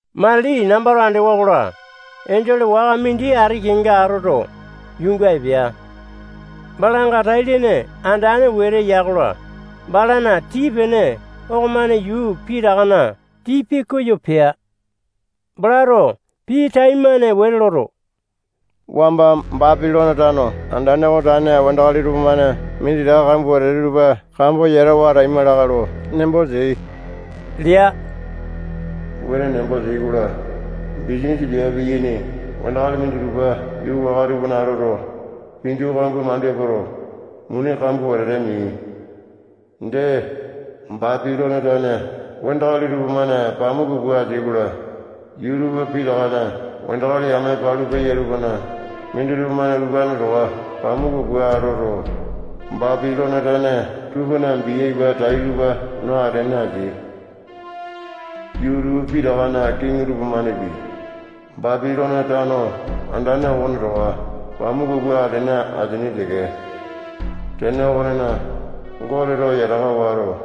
Matili nambato andewa-kola, enjole waka mindi ati kenga atoto, yuunga epea. Balanga tai-lene andane wete ya-kola, balana tii-pene okomane yuu pitakana tii pikoyo pea. Balato pii taimane wete loto, wamba Bapilone tano andane okona tane wandakali tupamane minditaka kambua wetete tupa kambo yatawa ataima lakae lo nembo teai lea. Wuane nembo teai-kola, bisanisa piape piyaini wandakali minditupa yuu waka tupana atoto, pinju kambua mandu epoto, muni kambua wetete meai. Dee, Bapilone tane wandakali tupamane pamuku pua ateai-kola, yuu tupa pitakana wandakali yame palu peya tupana minditupa-mane utupane towa pamuku pua atoto, Bapilone tane tupana bia ipa tai tupa no atene ateai. Yuu tupa pitakana kiŋi tupamanepi, Bapilone tano andane okone towa pamuku pua atene ateaini teke. Tene okonena, Goteto yataka wato,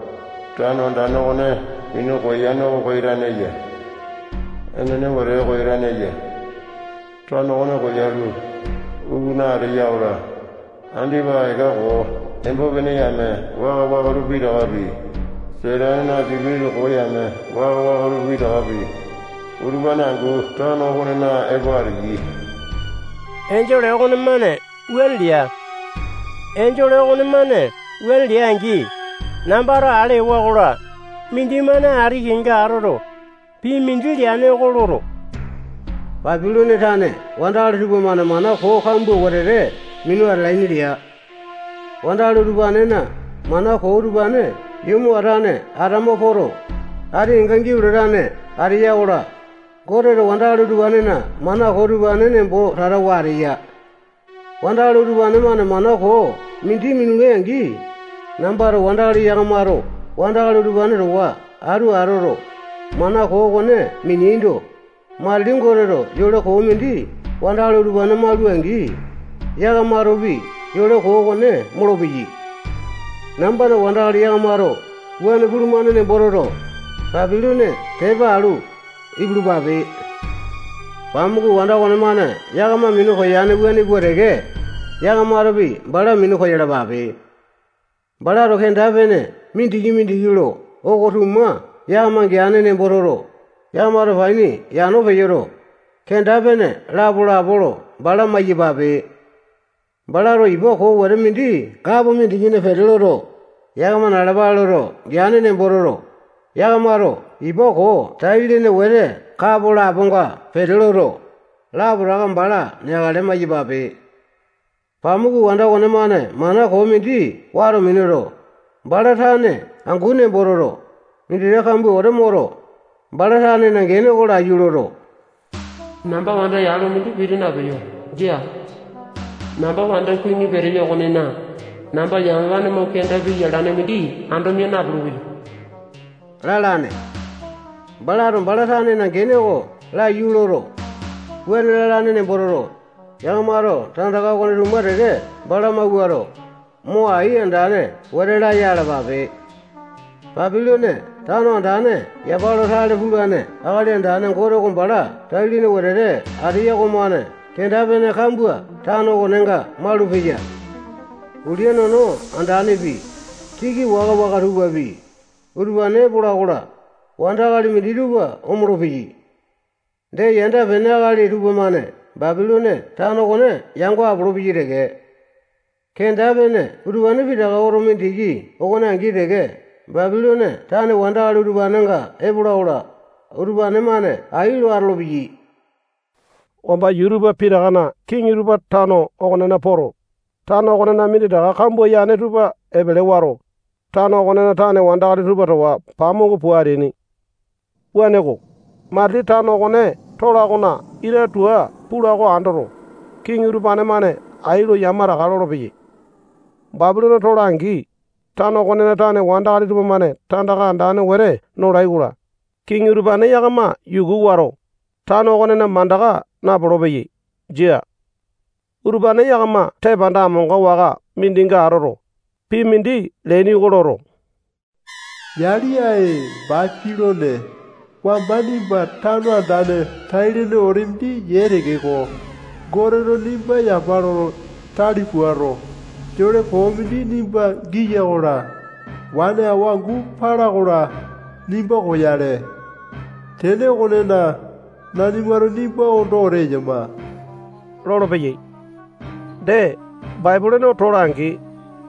tano andane okone minu koyane oko koyatane eya. Enene, wetete koyatane eya. Tano okone koyalu, ukuna ateya-kola, andipa eka koo embo-pene yame waka-waka tupa pitakapi, Satanena sipitisa koo yame waka-waka tupa pitakapi, utupane angu tano okonena epo ateyai. Enjole okonemane wuane lea. Enjole okonemane wuane lea-angi, nambato ale ewa-kola, mindimane ati kenga atoto, pii mindi leane oko loto, Bapilone tane wandakali tupamane mana koo kambua wetete minu atalaini lea. Wandakali utupanena mana koo utupane yomo atane atama poto, ati kenga giau latane ateya-kola, Goteto wandakali utupanena mana koo utupane nembo tatawa ateya. Wandakali utupane-mane mana koo mindi minulai-angi, nambana wandakali yakamato wandakali utupane towa atu atoto, mana koo okone mineaindo, matili Goteto yole koo mindi wandakali utupane maula-angi, yakamatopi yole koo okone molopeyai. Nambana wandakali yakamato wuane pulumane nembo toto, Bapilone tepa alu, ipulupape. Pamuku wanda okonemane yakama minu koyane, wuane pua teke yakamatopi bala minu koyalapape. Balato kenda-pene mindiki-mindiki lo oko-tuma yakama geane nembo toto, yakamato paini yano peyoto, kenda-pene lapo-lapo lo bala maiyapape. Balato ipa koo wete mindi kapo mindikina pete loto, yakama nalapale loto geane nembo toto, yakamato ipa koo tai-lene wete kapo laponga pete loto, lapotaka bala neakale maiyapape. Pamuku wanda okonemane mana koo mindi wato minuto, bala tane angu nembo toto, minditaka kambua wete moto, bala tanena gene oko laiyu loto, namba wanda yalo mindi piti napeyo. Jia. Namba wanda kuwini peteyo okonena, namba yamapane mo kenda piya alane mindi ando mia napulu-peyo lalane. Balato bala tanena gene oko laiyu loto, wuane lalane nembo toto, yakamato tandaka okone-tuma teke bala mawuato, mo ai andane wete laya alapape. Bapilone tano andane yapa lo tale pulane Akali Andane Gote oko bala tai-lene wetete ateya okomane kenda-pene kambua tano okonenga malupeya. Ulia nono andanepi, siki waka-waka tupapi, utupane epola-kola, wandakali minditupa omolo-peyai. Dee, yanda-pene akali tupamane Bapilone tano okone yango apolopeyai teke. Kenda-pene utupane pitaka oto mindiki okone angi teke Bapilone tane wandakali utupanenga epola-kola, utupane-mane ai lo atolopeyai. Wamba yuu tupa pitakana kiŋi tupa tano okonena poto, tano okonena minditaka kambua yane tupa epele wato, tano okonena tane wandakali tupa towa pamuku pua ateaini. Wuaneko, matili tano okone tola okona ita tua pula oko andoto, kiŋi utupane-mane ai lo yamataka lolopeyai. Bapilone tola-angi, tano okonena tane wandakali tupamane tandaka andane wete nolai-kola, kiŋi utupane yakama yuku wato, tano okonena mandaka napolo-peyai. Jia. Utupane yakama tepanda amonga waka mindinga atoto, pii mindi leaini oko loto, yali, ae, Bapilone, wamba nimba tano andane tai-lene wete mindi yee tekeko, Goteto nimba yapa lo tale puato, yole koo mindi nimba giya-kola, wane awa angu pala-kola, nimba koyale. Tene okonena, nanimato nimba ondo wete eyama lolopeyai. Dee, Bapilone tola-angi,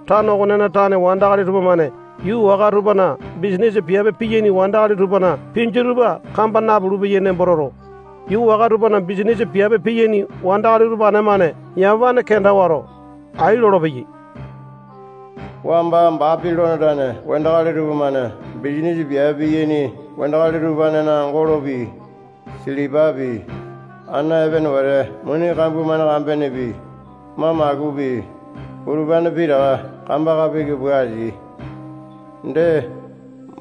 tano okonena tane wandakali tupamane yuu waka tupana bisanisa piape piyaini wandakali tupana pinju tupa kamba napulu-peyai nembo toto, yuu waka tupana bisanisa piape piyaini wandakali utupane-mane yamapane kenda wato, ai lolopeyai. Wamba Bapilone tane wandakali tupamane bisanisa piape piyaini wandakali utupanena golopi, silipapi, ana epene wete muni kambua-mane kambenepi, mamakupi, utupane pitaka kambaka piki pua ateai. Dee,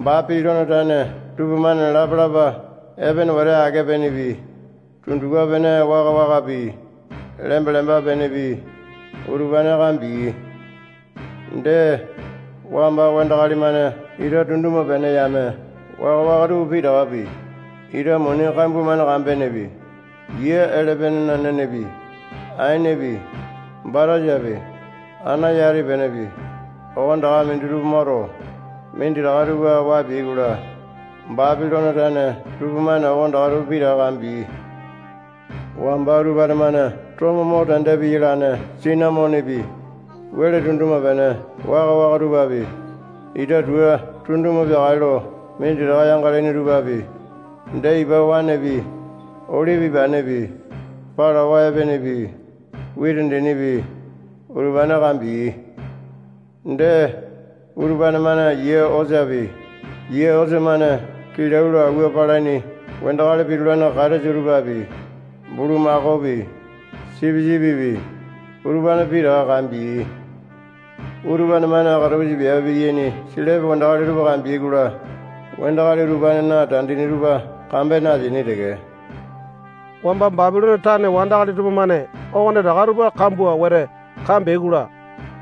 Bapilone tane tupamane lapalapa epene wete ake-penepi, tundupa-pene waka-wakapi, lemba-lemba penepi, utupane kambeai. Dee, wamba wandakali-mane ita tunduma-pene yame waka-waka tupa pitakapi, ita muni kambua-mane kambenepi, yia elepenena nenepi, aenepi, batasapi, ana yati penepi, okonetaka minditupa moto, minditaka tupa waa peai-kola, Bapilone tane tupamane okonetaka tupa pitaka kambeai. Wamba utupane-mane tomo mo tende piyalane sinamonepi, wele tunduma-pene waka-waka tupapi, ita tua tunduma peakale lo minditaka yangalaini tupapi, dee ipa waenepi, olipi ipanepi, palawa epenepi, witi dinipi, utupane kambeai. Dee, utupane-mane yia osapi, yia osa-mane kilau lo auwa palaini wandakali pitulane katesa tupapi, bulumakaopi, sipisipipi, utupane pitaka kambeai. Utupane-mane katapusa piape piyaini selepe wandakali tupa kambeai-kola, wandakali utupanena tandini tupa kambene ateaini teke. Wamba Bapilone tane wandakali tupamane okonetaka tupa kambua wete kambeai-kola,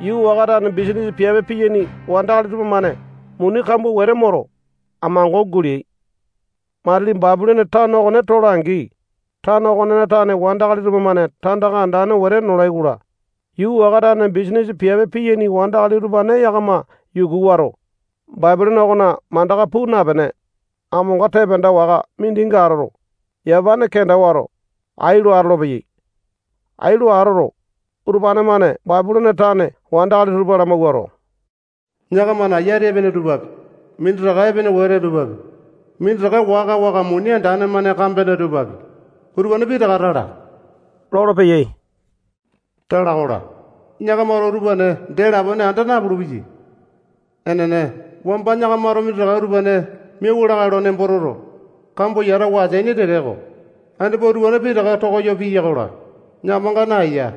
yuu waka tane bisanisa piape piyaini wandakali tupamane muni kambua wete moto, amango guleai. Matili Bapilone tano okone tola-angi, tano okonena tane wandakali tupamane tandaka andane wete nolai-kola, yuu waka tane bisanisa piape piyaini wandakali utupane yakama yuku wato, Bapilone okona mandaka puu napene, amonga tepanda waka mindinga atoto, yamapane kenda wato, ai lo atolopeyai. Ai lo atoto, utupane-mane Bapilone tane wandakali tupa lamawuato, yakamana yati epene tupapi, minditaka epene wete tupapi, minditaka waka-waka muni andane-mane kambene tupapi, utupane pitaka tala lolopeyai. Tala-kola, yakamato utupane dee lapone anda napulu-peyai. Enene, wamba yakamato minditaka utupane miauwa lakae lo nembo toto, kambo yatawa ateaini tekeko, andipa utupane pitaka tokoyo piya-kola, yakamanga naeya.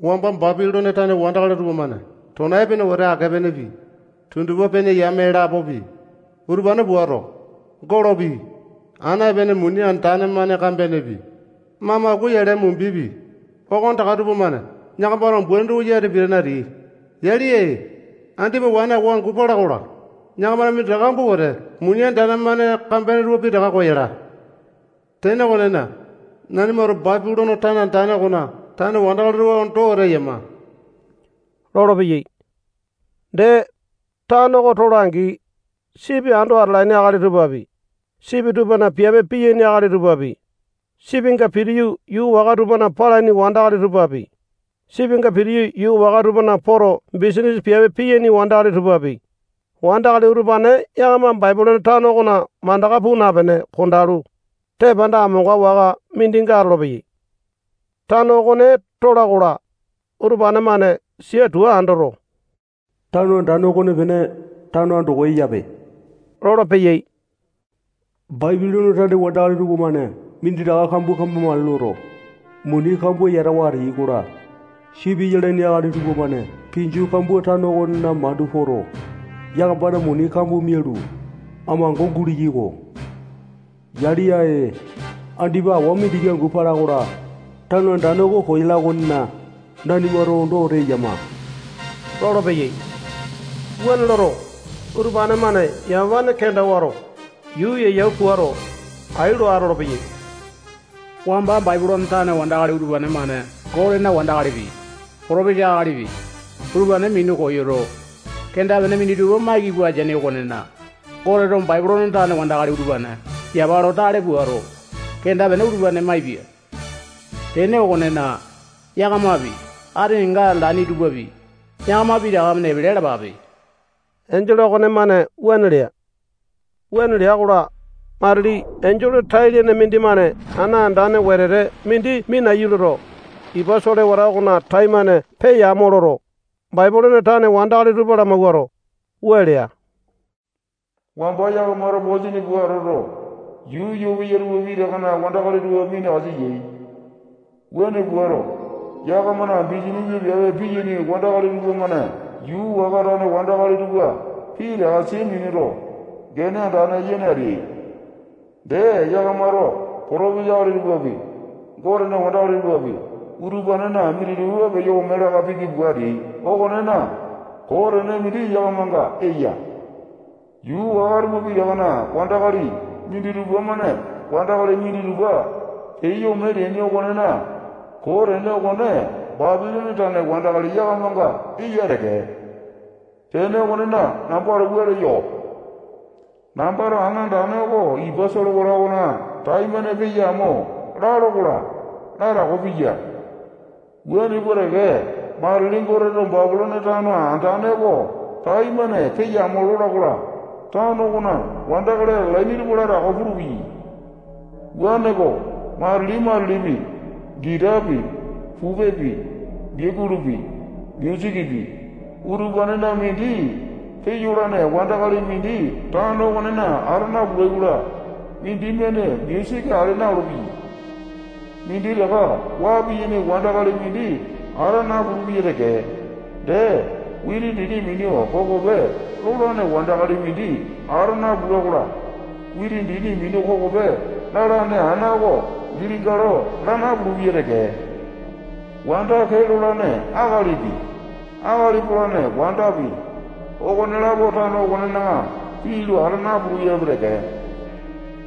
Wamba Bapilone tane wandakali tupamane tona epene wete ake-penepi, tundupa-pene yame lapopi, utupane puato, golopi, ana epene muni andane-mane kambenepi, mamaku yale mumbipi, okonetaka tupamane yakamana umbaini tupa yati pitane ateai. Yali, ae, andipa wane awa angu pala-kola, yakamana minditaka kambua wete muni andane-mane kambene tupa pitaka koyala. Tene okonena, nanimato Bapilone tano andane okona tane wandakali tupa ondo wete eyama lolopeyai. Dee, tano oko tola-angi, sipi ando atalaini akali tupapi, sipi tupana piape piyaini akali tupapi, sipinga pitiyu yuu waka tupana palaini wandakali tupapi, sipinga pitiyu yuu waka tupana poto bisanisa piape piyaini wandakali tupapi, wandakali utupane yakama Bapilone tano okona mandaka puu napene kondalu, tepanda amonga waka mindinga atolopeyai. Tano okone tola-kola, utupane-mane sia tua andoto, tano andane okonepene tano andoko eyape lolopeyai. Bapilone tane wandakali tupamane minditaka kambua kambamakale loto, muni kambua yatawa ateai-kola, sipi yalaini akali tupamane pinju kambua tano okonena mandu poto, yakamana muni kambua mialu, amango guleai-ko. Yali, ae, andipa awa mindiki angu pala-kola, tano andane oko koyapia okonena, nanimato ondo wete eyama lolopeyai. Wuane loto, utupane-mane yamapane kenda wato, yuu yeyau puato, ai lo atolopeyai. Wamba Bapilone tane wandakali utupane-mane Gotena wandakalipi, potopesa akalipi, utupane minu koyoto, kenda-pene minditupa maiki pua ateaini okonena, Goteto Bapilone tane wandakali utupane yapa lo tale puato, kenda-pene utupane maipia. Tene okonena, yakamapi, ati kenga atalaini tupapi, yakama pitaka-mane epele alapape. Enjole okonemane wuane lea. Wuane lea-kola, matili enjole tai-lene mindimane ana andane wetete mindi minaiyu loto, ipa solewata okona taimane peya amo loto, Bapilone tane wandakali tupa lamawuato, wua lea: Wamba yakamato posini pua atoto, yuu yoo peya tupa pitakana wandakali tupa minakasa yai. Wuane puato, yakamana bisanisa piape piyaini wandakali tupamane yuu waka tane wandakali tupa pitaka sia minuto, gene andane yene ateai. Dee, yakamato potopesa akali tupapi, Gotena wandakali tupapi, utupanena minditupa peyo ome laka piki pua ateai okonena, koo tene mindi yakamanga eya. Yuu waka tupa pitakana wandakali minditupa-mane wandakali minditupa peyo ome leaini okonena, koo tene okone Bapilone tane wandakali yakamanga eya teke. Tene okonena, nambato wua leyo. Nambato ana andane oko ipa solewata okona taimane peya amo lalo-kola, latako piya. Wuane pua teke, matili Goteto Bapilone tano andane oko taimane peya amo lola-kola, tano okona wandakali atalaini tupa latako pulupeyai. Wuaneko, matili-matilipi gitapi, pupepi, biakulupi, musikipi, utupanena mindi peyolane wandakali mindi tano okonena ata napulai-kola, mindimane musiki ale na-olopeya. Minditaka waa piyaini wandakali mindi ata napulu-peya teke. Dee, witi dini minu kokope lolane wandakali mindi ata napula-kola, witi dini minu kokope lalane ana oko gili galo laa napulu-peya teke. Wanda kee lolane akalipi, akali polane wandapi, okonelapo tano okonena pii lo ata napulu-peyapi teke.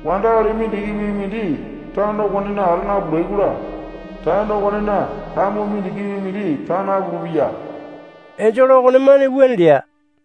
Wandakali mindikipi mindi tano okonena ata napulai-kola, tano okonena lamu mindikipi mindi taa napulu-peya. Enjole okonemane wuane lea.